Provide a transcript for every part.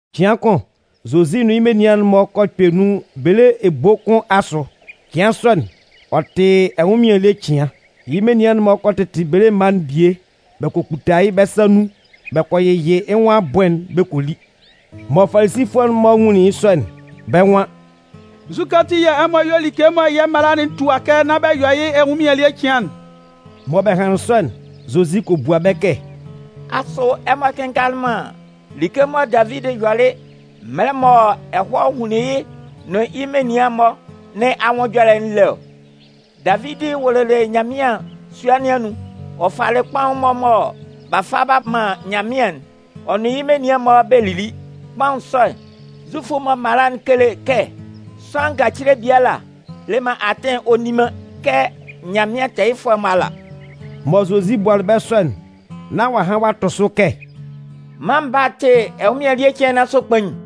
Cɩan kʋn Zozi nʋn yɩ́ menian'n-mɔ kɔ kpɛ nun bele ebo kʋn asʋ. Cɩan sɔ'n, ɔ tɩ ɛnwʋnmɩan ele cɩan. Yɩ́ menian'n-mɔ kɔ tɩtɩ bele mma'n bie bɛ kɔ kputa yɩ́ bɛ́ sa nun bɛ kɔ yɩyɩ yɩ́ nwʋn abʋɩn'n bɛ kɔ li. Mɔ Falisifʋɛ'n-mɔ nwunlin yɩ́ sɔ'n, bɛ́ nwan: “Nzukɛ ati yɛ̂ ɛmɔ yɔ like mɔ yɛ́ mala'n tua kɛ nán bɛ yɔ yɩ́ ɛnwʋnmɩan ele cɩan'n?” Mɔ bɛ hanlɩn sɔ'n, Zozi kɔ bua bɛ́ kɛ: “Asʋ ɛmɔ kɩnngalɩ man like mɔ Davidi yɔlɩ, mɛlɛ mɔ ɛhɔɛ hunlin yɩ́ nʋn yɩ́ menian'n-mɔ nɩn anwʋn ɛjɔlɛ'n lé ɔ? Davidi wʋlʋlɩ Nyanmɩan sua nɩn anun, ɔ falɩ kpaʋn'n-mɔ mɔ b'a fa b'a man Nyanmɩan'n, ɔ nʋn yɩ́ menian'n-mɔ bɛ lili. Kpaʋn sɔ'n, Zufʋ'n-mɔ mala'n kele kɛ sʋanlan ngacile biala le man atɩn ɔ nni man kɛ Nyanmɩan tɛɛyɩfʋɛ'n-mɔ ala.” Mɔ Zozi bualɩ bɛ́ sɔ'n, nán ɔ'a han ɔ'a tʋ sʋ kɛ: “Mân Baa'n tɩ ɛnwʋnmɩan ele cɩan nɩn asʋ kpain.”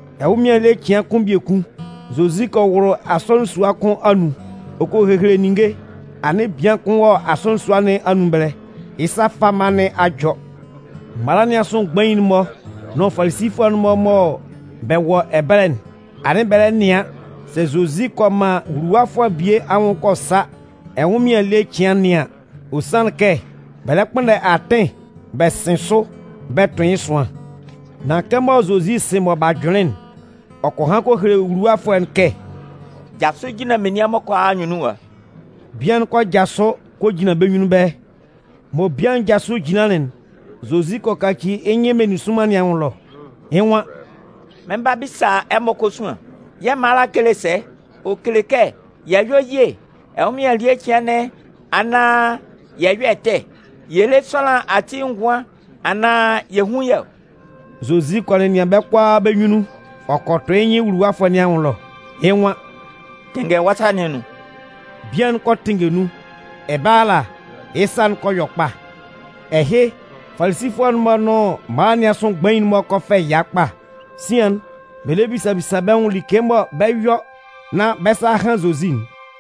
Ɛnwʋnmɩan ele cɩan kʋn biekun, Zozi kɔ wʋlʋ asɔnɩn sua kʋn anun, ɔ kɔ hehele ninnge. Anɩn bian kʋn wɔ asɔnɩn sua nɩn anun ɛbɛlɛ, yɩ́ sa fama nɩn a jɔ. Mala nɩn asʋ mgbain'n-mɔ nʋn Falisifʋɛ'n-mɔ mɔ bɛ wɔ ɛbɛlɛ'n, anɩn bɛ lɛ nɩan sɛ Zozi kɔ man wuluwafʋɛ bie anwʋn kɔ sa ɛnwʋnmɩan ele cɩan nɩn an. Ɔ sanlɩn kɛ bɛ lɛ kpʋnndɛ atɩn bɛ sɩn sʋ bɛ tʋn yɩ́ ɛsʋan. Nan kɛmɔ Zozi sɩ mɔ b'a jʋnlɩn'n, ɔ kɔ han kɔ hele wuluwafʋɛ'n kɛ: “Jasʋ jinlan menian'n-mɔ kʋalaa anyunnun ɛwa.” Bian'n kɔ jasʋ kɔ jinlan bɛ́ nyunnun ɛbɛlɛ. Mɔ bian'n jasʋlɩ jinlanlɩn'n Zozi kɔ kaci yɩ́ nyɩn meninsʋnman nɩn anwʋn ɛlɔ, yɩ́ nwan: “Mɩn 'ba bisa ɛmɔ kosuan. Yɛ́ mala'n kele sɛ? Ɔ kele kɛ yɛ yɔ́ ye ɛnwʋnmɩan ele cɩan nɩn anaan yɛ yɔ́ ɛtɛ? Yɛ lé sʋanlan ati ngʋan anaan yɛ hún yɩ́ ɔ?” Zozi kɔ nɛnɩan bɛ́ kʋalaa bɛ́ nyunnun, ɔ kɔ tʋ yɩ́ nyɩn wuluwafʋɛ nɩn anwʋn ɛlɔ, yɩ́ nwan: “Tɩnngɛ wɔ́ sa nɩn anun.” Bian'n kɔ tɩnngɛ nun, ɛbɛlɛ ala, yɩ́ sa'n kɔ yɔ kpa. Ɛhɩ, Falisifʋɛ'n-mɔ nʋn mala nɩn asʋ mgbain'n-mɔ kɔ fɛ ɛya kpa. Sian'n bɛ lɛ bisa bisa bɛ́ nwʋn like mɔ bɛ 'yɔ nán bɛ́ sa a han Zozi'n.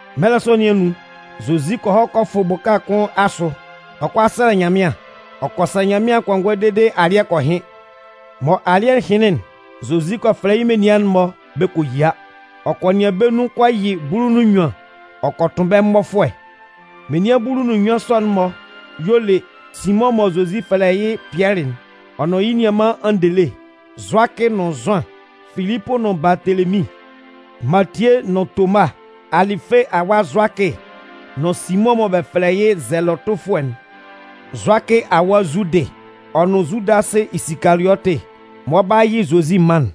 Mɛlɛ sɔ nɩn anun, Zozi kɔ hɔ kɔ fʋ bʋka kʋn asʋ. Ɔ 'kɔ a sɛlɛ Nyanmɩan. Ɔ kɔ sɛlɛ Nyanmɩan kɔngɔɛ dede alɩ́ɛ kɔ hɩn. Mɔ alɩ́ɛ hɩnlɩn'n, Zozi kɔ fɛfɛlɛ yɩ́ menian'n-mɔ bɛ kɔ yia. Ɔ kɔ nɩan bɛ́ nun kɔ yɩ bulu nʋn nnyuan ɔ kɔ tʋn bɛ́ mmɔfʋɛ. Menian bulu nʋn nnyuan sɔ'n-mɔ y'ɔ le: Simʋn mɔ Zozi fɛlɛ yɩ́ Pɩɛlɩ'n, ɔ nʋn yɩ́ nianman Andele, Zʋakɩ nʋn Zʋan, Filipʋ nʋn Baatelemin, Matie nʋn Toma, Alɩfe awa Zʋakɩ nʋn Simʋn mɔ bɛ fɛlɛ yɩ́ Zɛlɔtʋfʋɛ'n, Zʋakɩ awa Zudɩ, ɔ nʋn Zudasɩ Isikaliɔtɩ mɔ ɔ 'ba yɩ Zozi man'n.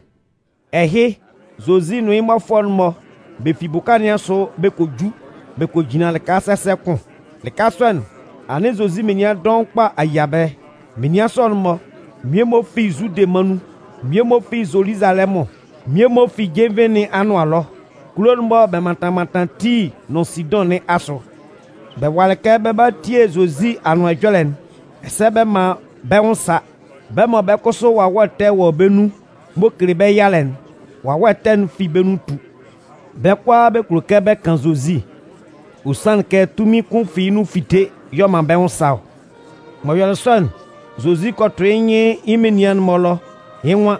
Ɛhɩ, Zozi nʋn yɩ́ mmɔfʋɛ'n-mɔ, bɛ fi bʋka nɩn asʋ, bɛ kɔ ju bɛ kɔ jinlan lɩka sɛsɛ kʋn. Lɩka sɔ'n, anɩn Zozi menian dɔʋn kpa a yia ɛbɛlɛ. Menian sɔ'n-mɔ, mmie-mɔ fi Zude mân nun. Mmie-mɔ fi Zoluzalɛmʋn. Mmie-mɔ fi jenvie nɩn anʋan ɛlɔ kulo'n-mɔ mɔ bɛ mantan mantan Tii nʋn Sidʋn nɩn asʋ. Bɛ walɩ kɛ bɛ 'ba a tie Zozi Anʋan Ɛjɔlɛ'n, ɛsɛ bɛ man bɛ́ nwʋn sa. Bɛ́ mɔ bɛ́ kʋsʋ wawɛ ɛtɛ wɔ bɛ́ nun m'ɔ kele bɛ́ yalɛ'n, wawɛ ɛtɛ'n fi bɛ́ nun tu. Bɛ́ kʋalaa bɛ kulo kɛ bɛ kan Zozi. Ɔ sanlɩn kɛ tunmin kʋn fi yɩ́ nun fite y'ɔ man bɛ́ nwʋn sa ɔ. M'ɔ yɔlɩ sɔ'n, Zozi kɔ tʋ yɩ́ nyɩn yɩ́ menian'n-mɔ ɛlɔ yɩ́ nwan: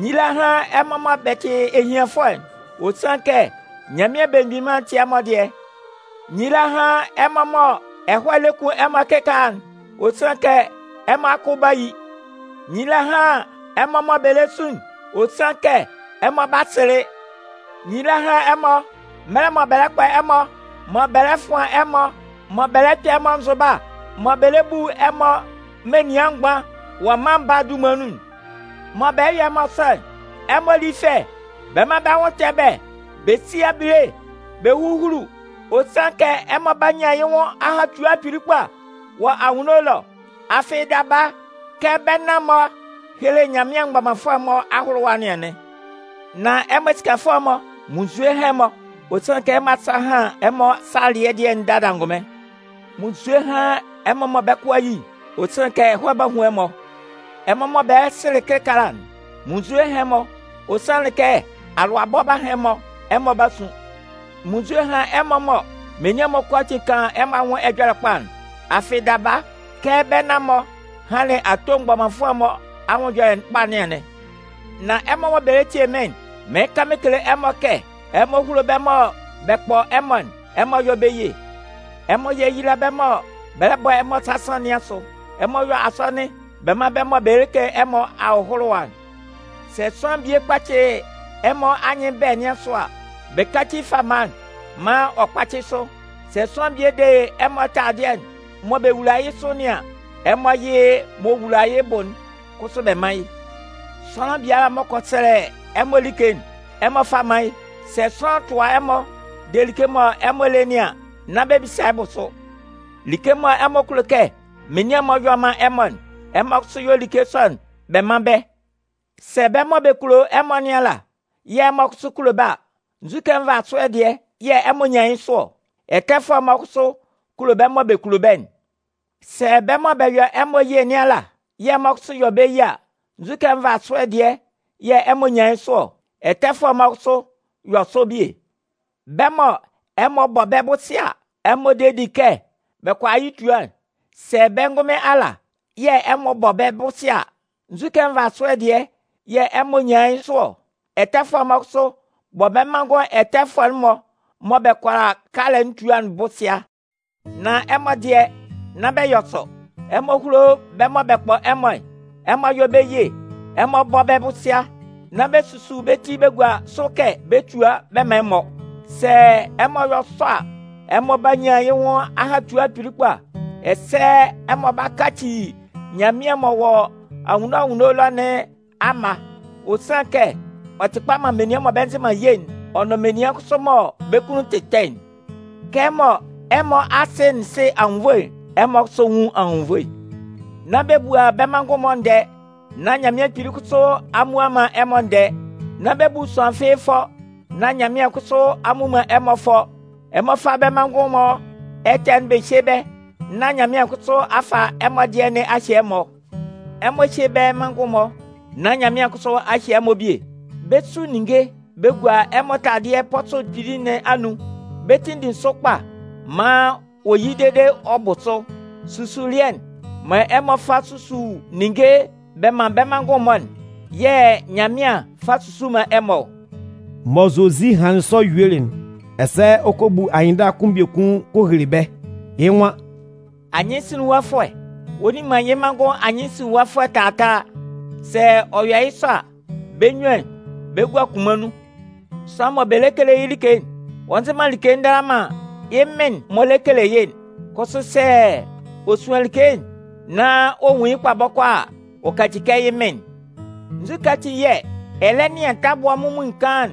“Nyila hán ɛmɔ mɔ bɛ tɩ ehianfʋɛ'n, ɔ sanlɩn kɛ Nyanmɩan Belemgbin Mân'n tɩ ɛmɔ dɩɛ! “Nyila hán ɛmɔ mɔ ɛhɔɛ lɛ kun ɛmɔ kɩkaala'n, ɔ sanlɩn kɛ ɛmɔ akʋ 'ba yi. “Nyila hán ɛmɔ mɔ bɛ le sun'n, ɔ sanlɩn kɛ ɛmɔ 'ba sɩlɩ. “Nyila hán ɛmɔ, mɛlɛ mɔ bɛ lɛ kpɔ ɛmɔ, mɔ bɛ lɛ fʋan ɛmɔ, mɔ bɛ lɛ kpɛ ɛmɔ nzʋba, mɔ bɛ lɛ bu ɛmɔ menian mgban wɔ Mân Baa'n dunman nun. Mɔ bɛ 'yɔ ɛmɔ sɔ'n, ɛmɔ lí fɛ bɛ mán bɛ́ nwʋn tɛ bɛ́ bɛ sí abile bɛ húhulu. Ɔ sanlɩn kɛ ɛmɔ 'ba nyan yɩ́ nwʋn ahatua kpili kpa wɔ anwunno ɛlɔ. Afɩ daba, kɛ bɛ́ nan-mɔ helelɩ Nyanmɩan mgbɔmanfʋɛ'n-mɔ ahʋlʋwa nɩn anɩn. “Nan ɛmɔ esikafʋɛ'n-mɔ, munnzue hán ɛmɔ! Ɔ sanlɩn kɛ ɛmɔ asa a han ɛmɔ salɩɛ dɩɛ'n dada angʋnmɩn. “Munnzue hán ɛmɔ mɔ bɛ́ kʋ a yi'n! Ɔ sanlɩn kɛ ɛhɔɛ 'ba hun ɛmɔ. “Ɛmɔ mɔ bɛ lɛ sɩlɩ kɩkaala'n, munnzue hán ɛmɔ! Ɔ sanlɩn kɛ alʋabɔ 'ba han ɛmɔ, ɛmɔ 'ba sun. “Munnzue hán ɛmɔ mɔ menian'n-mɔ kʋalaatin kan ɛmɔ anwʋn ɛjɔlɛ kpa'n. Afɩ daba, kɛ bɛ́ nan-mɔ hanlɩn ato mgbɔmanfʋɛ'n-mɔ anwʋn ɛjɔlɛ kpa nɩn anɩn. “Nan ɛmɔ mɔ bɛ lɛ tie mɩ́n'n, mɩɩn kan mɩn kele ɛmɔ kɛ: Ɛmɔ húlo bɛ́ mɔ bɛ kpɔ ɛmɔ'n. Ɛmɔ yɔ́ bɛ́ ye. Ɛmɔ yéyila bɛ́ mɔ bɛ bɔ ɛmɔ sasan nɩn asʋ. Ɛmɔ yɔ́ asɔnɩn bɛ man bɛ́ mɔ bɛ kele ɛmɔ ahʋlʋwa'n. Sɛ sʋanlan bie kpacɩ ɛmɔ anyɩn bɛ̂ nɩn asʋ a, bɛ káci fama'n maan ɔ kpácɩ sʋ. Sɛ sʋanlan bie de ɛmɔ taladɩɛ'n mɔ bɛ wula yɩ́ sʋ nɩn an, ɛmɔ yɩ́ mɔ ɛmɔ wula yɩ́ bʋ'n kʋsʋ bɛ mán yɩ́. Sʋanlan biala m'ɔ kɔ sɛlɛ ɛmɔ like'n, ɛmɔ fá mán yɩ́. Sɛ sʋanlan tʋa ɛmɔ de like mɔ ɛmɔ le nɩn an, nán bɛ bisa yɩ́ bʋsʋ. Like mɔ ɛmɔ kulo kɛ menian'n-mɔ yɔ man ɛmɔ'n, ɛmɔ kʋsʋ yɔ́ like sɔ'n bɛ mán bɛ́. “Sɛ bɛ́ mɔ bɛ kulo ɛmɔ nɩn ala yɛ̂ ɛmɔ kʋsʋ kulo bɛ́ a, nzu nvasʋɛ dɩɛ yɛ̂ ɛmɔ nyan yɩ́ sʋ ɔ? Ɛtɛfʋɛ'n-mɔ kʋsʋ kulo bɛ́ mɔ bɛ kulo bɛ́'n. Sɛ bɛ́ mɔ bɛ yɔ ɛmɔ ye nɩn ala yɛ̂ ɛmɔ kʋsʋ yɔ bɛ́ ye a, nzu nvasʋɛ dɩɛ yɛ̂ ɛmɔ nyan yɩ́ sʋ ɔ? Ɛtɛfʋɛ'n-mɔ kʋsʋ yɔ sɔ bie. Bɛ́ mɔ ɛmɔ bɔ bɛ́ bʋsɩa a ɛmɔ de di kɛ bɛ kʋala yɩ́ tua'n, sɛ bɛ́ ngʋnmɩn ala yɛ̂ ɛmɔ bɔ bɛ́ bʋsɩa a, nzu nvasʋɛ dɩɛ yɛ̂ ɛmɔ nyan yɩ́ sʋ ɔ? Ɛtɛfʋɛ'n-mɔ kʋsʋ bɔ bɛ́ manngʋn ɛtɛfʋɛ'n-mɔ mɔ bɛ kʋala kalɛ'n tua'n bʋsɩa. Nan ɛmɔ dɩɛ, nán bɛ yɔ sɔ. Ɛmɔ húlo bɛ́ mɔ bɛ kpɔ ɛmɔ'n, ɛmɔ yɔ́ bɛ́ ye, ɛmɔ bɔ́ bɛ́ bʋsɩa, nán bɛ susu bɛ́ ti bɛ gua sʋ kɛ bɛ túa bɛ mán ɛmɔ. Sɛ ɛmɔ yɔ sɔ a, ɛmɔ 'ba nyan yɩ nwʋn ahatua kpili kpa, ɛsɛ ɛmɔ 'ba kaci Nyanmɩan m'ɔ wɔ anwunno anwunno ɛlɔ nɩn amma. Ɔ sanlɩn kɛ ɔ tɩ kpa man menian mɔ bɛ nzɩ man ye'n, ɔ nʋn menian kʋsʋ mɔ bɛ́ kunnun tɩ ɛtɛ'n. Kɛmɔ ɛmɔ Asɩ'n sɩ anwunnvoe'n, ɛmɔ kʋsʋ nwún anwunnvoe. “Nán bɛ bua bɛ́ manngʋn'n-mɔ ndɛɛ nán Nyanmɩan Kpili kʋsʋ a mmua man ɛmɔ ndɛɛ. Nán bɛ bu sʋanlan fɩ́ɩ́ fʋɔ nán Nyanmɩan kʋsʋ a mmu man ɛmɔ fʋɔ. Ɛmɔ fá bɛ́ manngʋn'n-mɔ ɛtɛ'n bɛ hyé bɛ́ nán Nyanmɩan kʋsʋ a fa ɛmɔ dɩɛ nɩn a hye ɛmɔ. Ɛmɔ hyé bɛ́ manngʋn'n-mɔ nán Nyanmɩan kʋsʋ a hye ɛmɔ bie. Bɛ 'su ninnge bɛ gua ɛmɔ taladɩɛ'n pɔsʋ kpili nɩn anun, bɛ 'tinndin sʋ kpa maan ɔ yi dede ɔ bʋ sʋ. Susulɩɛ'n mɔ ɛmɔ fa bɛ susu ninnge bɛ man bɛ́ manngʋn-mɔ'n, yɩ́ yɛ̂ Nyanmɩan 'fa susu man ɛmɔ ɔ.” Mɔ Zozi hanlɩn sɔ yuelɩ'n, ɛsɛ ɔ kɔ bu anyɩnndala kʋn biekun kɔ hele bɛ́, yɩ́ nwan: “Anyɩnsinlinwafʋɛ, ɔ nni man yɩ́ manngʋn anyɩnsinlinwafʋɛ taataa. Sɛ ɔ yɔ yɩ́ sɔ a, bɛ́ munnyuan bɛ 'gua kunman nun. Sʋanlan mɔ bɛ lɛ kele yɩ́ like'n, ɔ nzɩ man like ndala man yɩ́ mɩn'n m'ɔ lɛ kele yɩ́'n. Kʋsʋ sɛ ɔ suan like nán ɔ nwun yɩ́ kpa bɔkɔɔ a, ɔ kaci kɛ yɩ́ mɩn'n. “Nzukɛ ati yɛ̂ ɛ lɛ nɩan tabʋa munmuin kaan'n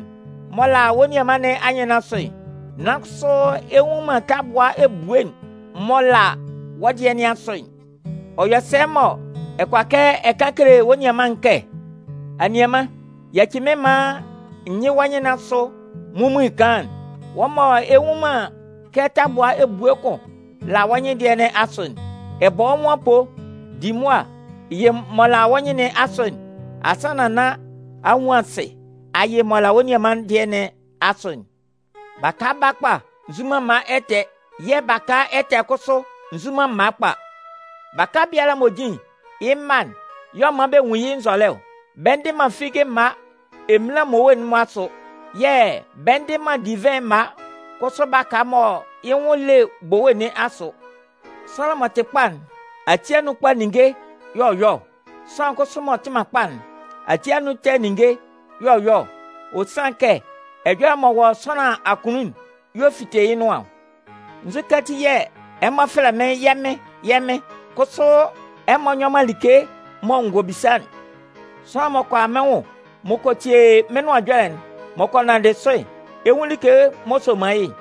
m'ɔ la wɔ́ nianman nɩn anyɩn nɩn asʋ, nan kʋsʋ ɛ nnwun man tabʋa ebue'n m'ɔ la wɔ́ dɩɛ nɩn asʋ'n? Ɔ yɔ sɛ mɔ ɛ kʋala ɛ kan kele wɔ́ nianman'n kɛ: ‘Anianman, yaci mɩ́n maan n yɩ́ wɔ́ nyɩn nɩn asʋ munmuin kaan'n’, wɔ́ mɔ ɛ nnwun man kɛ tabua ebue kʋn la wɔ́ nyɩn dɩɛ nɩn asʋ'n? Ɛ bɔ wɔ́ nwʋn apoo. Di mʋa yɩ m'ɔ la wɔ́ nyɩn nɩn asʋ'n, asannan nán a nwun asɩ a yɩ m'ɔ la wɔ́ nianman'n dɩɛ nɩn asʋ'n. “Baka kpa nzu man mma ɛtɛ yɛ̂ baka ɛtɛ kʋsʋ nzu man mma kpa. Baka biala m'ɔ jin'n, yɩ́ mma'n y'ɔ man bɛ nwun yɩ́ nzɔlɛ ɔ. Bɛ ndɩ man figi mma eminlan mmowe'n-mɔ asʋ. Yɛ̂ bɛ ndɩ man divɩn mma kʋsʋ baka mɔ yɩ́ nwʋn le bowe nɩn asʋ. Sʋanlan m'ɔ tɩ kpa'n, ati anun kpa ninnge y'ɔ yɔ ɔ. Sʋanlan kʋsʋ m'ɔ tɩ man kpa'n, ati anun ɛtɛ ninnge y'ɔ yɔ ɔ. Ɔ sanlɩn kɛ ɛjɔlɛ m'ɔ wɔ sʋanlan akunnun'n y'ɔ fite yɩ́ nʋan ɔ. “Nzukɛ ati yɛ̂ ɛmɔ fɛlɛ mɩ́n ‘yɛ́ Mɩn, yɛ́ Mɩn’, kʋsʋ ɛmɔ nyɔ man like mɔ n gɔ bisa'n? Sʋanlan m'ɔ kɔ a mɩ́n nwʋn, m'ɔ kɔ tie mɩ́n nʋan ɛjɔlɛ'n, m'ɔ kɔ nanndɩ sʋ'n, ɛ 'nwun like m'ɔ soman yɩ́'n: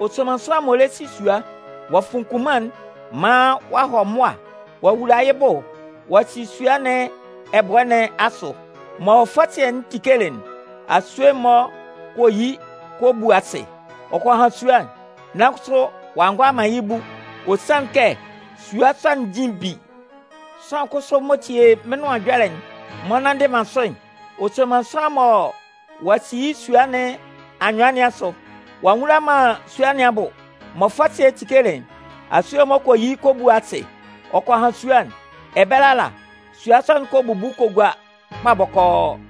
Ɔ soman sʋanlan m'ɔ lɛ si sua. Ɔ'a fun kunman'n maan ɔ'a hɔ mʋa ɔ'a wula yɩ́ bʋ ɔ'a si sua nɩn ɛbʋɛ nɩn asʋ. Mɔ fɔsɩɛ'n tikelɩ'n, asue'n-mɔ kɔ yi kɔ bu asɩ ɔ kɔ han sua'n, nan kʋsʋ ɔ'a ngʋala man yɩ́ bu. Ɔ sanlɩn kɛ sua sɔ'n jin bi. Sʋanlan kʋsʋ m'ɔ tie mɩ́n Nʋan Ɛjɔlɛ'n m'ɔ nnanndɩ man sʋ'n, ɔ soman sʋanlan mɔ ɔ'a si yɩ́ sua nɩn anyʋan nɩn asʋ. Ɔ'a nwula man sua nɩn abʋ. Mɔ fɔsɩɛ'n tikelɩ'n, asue'n-mɔ kɔ yi kɔ bu asɩ ɔ kɔ han sua'n. Ɛbɛlɛ ala, sua sɔ'n kɔ bubu kɔ gua kpa bɔkɔɔ.”